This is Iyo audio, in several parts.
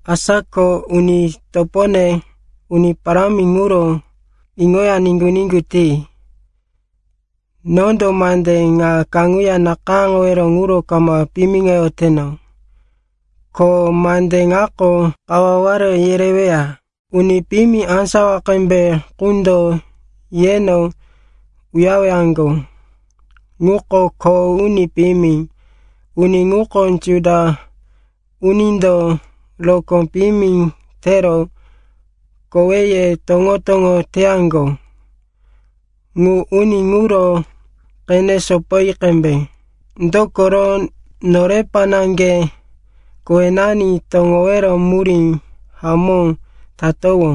Asa ko, uni topone, Uni Parámi ŋuro iŋoya niŋgu-niŋgu ti. Nondo mande ŋa kaŋuya nakayáŋowero ŋuro kama piyimiŋoyoteno. Ko mande ŋako kawaware yereweya. Uni piyimi á sawa qembe qundo yeno uyarewaŋgo, ŋuko kho uni piyimi, uni ŋuko Juda unindo rokó piyimi tero koweye toŋo-toŋo teyaŋgo. Ŋu uni ŋuro qene sopoyi qembe. Dokoro norepa naŋge kowenani toŋowero murí hamó tatowó,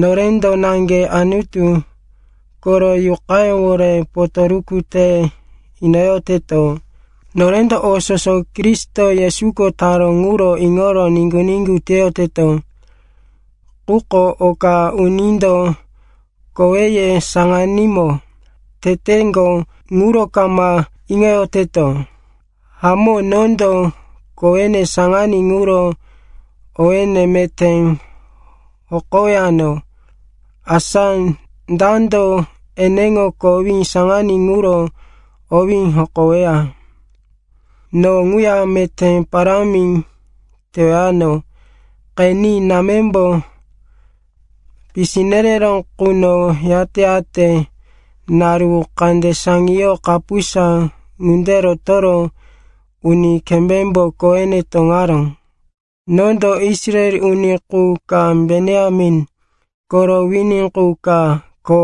norendo naŋge Anutu koro Yuqayówore potoruku te inoyoteto. Norendo o soso Kristo Yesuko taró ŋuro iŋoro niŋgu-niŋgu teyoteto, quko oka unindo koweye saŋanímo teteŋgo ŋuro kama iŋoyoteto. Hamó, nondo kowene saŋaní ŋuro owéne meté hokowano. Asa dando eneŋo kowí saŋaní ŋuro owí hokoweya? No ŋuya meté parámi tewano. Qeni. Námembo pisi nereró quno yate-yate naru kande saŋiyoro kapusa ŋunde rotoro uni kembémbo kowene toŋaró. Nondo Israel uni qu ka, Benjamin koro wini qu ka, ko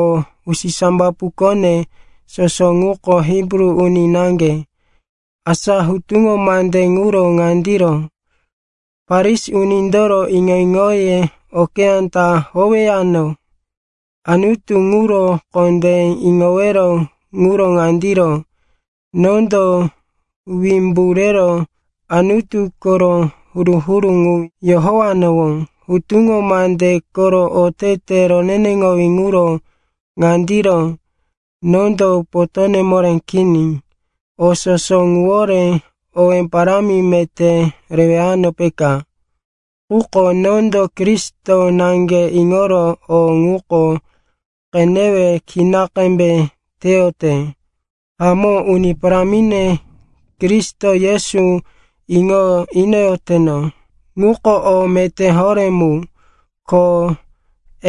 usisambapukone soso ŋuko Hibru uni naŋge. Asa hutuŋo mande ŋuro ŋandiro: Farisi unindoro iŋo-iŋoye okeyá ta howeyano. Anutu ŋuro kondé iŋowero ŋuro ŋandiro: nondo wimbu rero Anutu koro huru-huru ŋu yohowanowó. Hutuŋo mande koro otete roneneŋowí ŋuro ŋandiro: nondo potóne moré kini. O soso ŋuwore owé parámi meté rewano, peka. Quko nondo Kristo naŋge iŋoro o ŋuko qenewe kina qembe teyote. Hamó, Uni Parámine Kristo Yesu iŋo inoyoteno ŋuko o meté horé mu, ko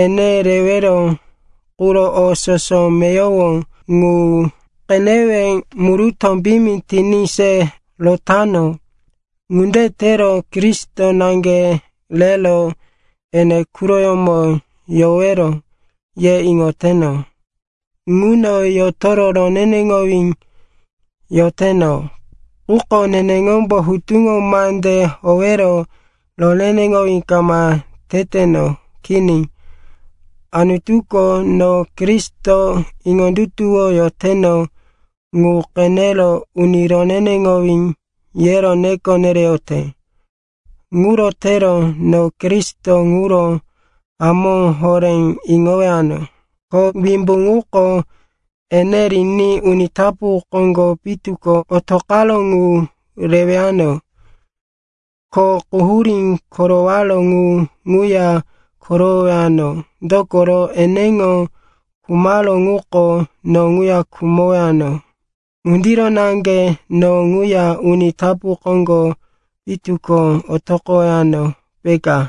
ene rewero quro o soso meyowo ŋu qenewe murutó piyimi tiní se rotano. Ŋunde tero, Kristo naŋge rero ene quroyómo yowero, ye iŋoteno. Ŋuno yotoro roneneŋowí yoteno. Quko neneŋombo hutuŋo mande howero roneneŋowí kama teteno. Kini, Anutuko no Kristo iŋondutuwoyoteno ŋu qenero, uni roneneŋowí, yero neko nereyote. Ŋuro tero no Kristo ŋuro hamó horé iŋowano, ko wimbu ŋuko ene riní uni tapu koŋgo pitu ko otoqaró ŋu rewano, ko quhurí korowaró ŋu ŋuya korowowano, dokoro, eneŋo khumaró ŋuko no ŋuya khumowano. Ŋundiro naŋge no ŋuya uni tapu koŋgo pitu ko otoqowano, peka.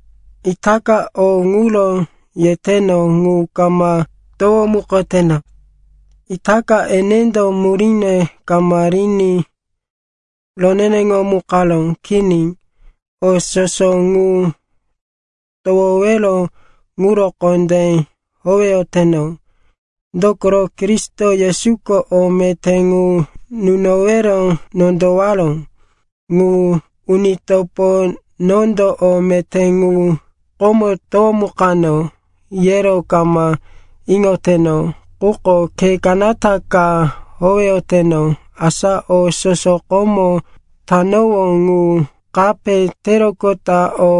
Itaka o ŋuro yeteno ŋu kama towomukoteno, itaka enendo muríne kama riní roneneŋomukaró. Kini, o soso ŋu towowero ŋuro kondé howeyoteno. Dokoro Kristo Yesuko o meté ŋu nunowero nondowaró. Uni topo, nondo o meté ŋu komo towomukano yero kama iŋoteno. Quko khe kanata ka howeyoteno; asa o soso komo tanowó ŋu kape teroqota o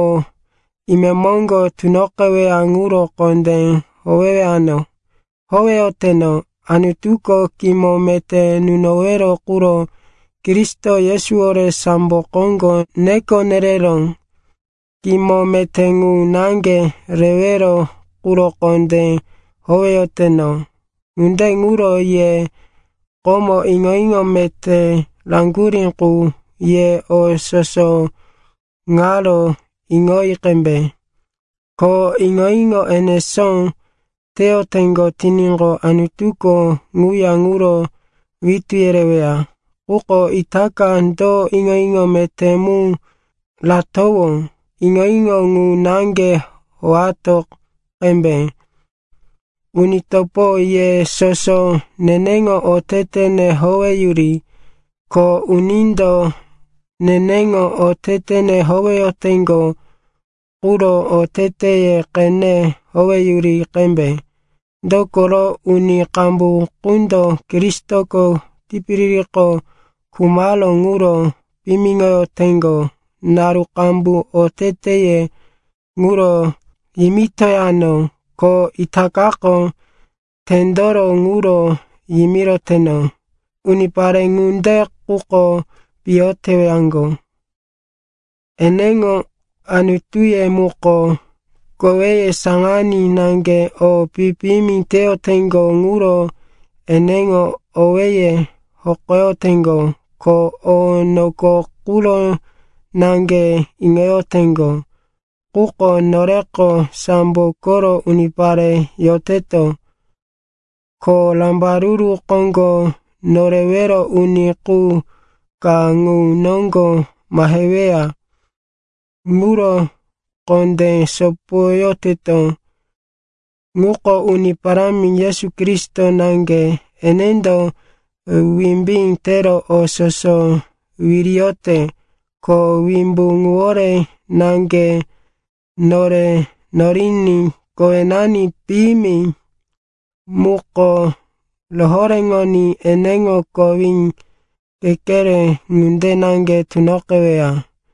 imemoŋgo tunoqeweya ŋuro kondé howeyoteno. Anutuko kimo meté nunowero quro Kristo Yesuwore sambo koŋgo neko nereró. Kimo meté ŋu naŋge rewero quro kondé howeyoteno. Ŋunde ŋuro ye komo iŋo-iŋo meté raŋgurí qu, ye o soso ŋaro iŋoyi qembe. Ko iŋo-iŋo enesó teyoteŋgo tiníqo, Anutuko ŋuya ŋuro witú yereweya. Quko itaka do iŋo-iŋo meté mu ratowó, iŋo-iŋo ŋu naŋge howato qembe. Uni topo, ye soso neneŋo otetene howeyuri. Ko unindo neneŋo otetene howeyoteŋgo quro oteteye qene howeyuri qembe. Dokoro uni qambu qundo Kristoko tipiririko khumaró ŋuro piyimiŋoyoteŋgo. Naru qambu oteteye ŋuro yimitoyano, ko itakako tendoro ŋuro yimiroteno. Unipare ŋunde quko piyo tewaŋgo, eneŋo anutuye muko koweye saŋaní naŋge, o pi-piyimi teyoteŋgo ŋuro eneŋo owéye hokoyoteŋgo. Ko o noko quro naŋge iŋoyoteŋgo. Quko noreko sambo koro unipare yoteto. Ko Rambaruru Koŋgo Norewero Uni qu ka ŋu noŋgo maheweya ŋuro kondé sopoyoteto, ŋuko Uni Parámi Yesu Kristo naŋge. Enendo wimbí tero o soso wiriyote. Ko wimbu ŋuwore naŋge nore noriní kowenani piyimi muko rohoréŋoní eneŋo kowí kekere ŋunde naŋge tunoqeweya.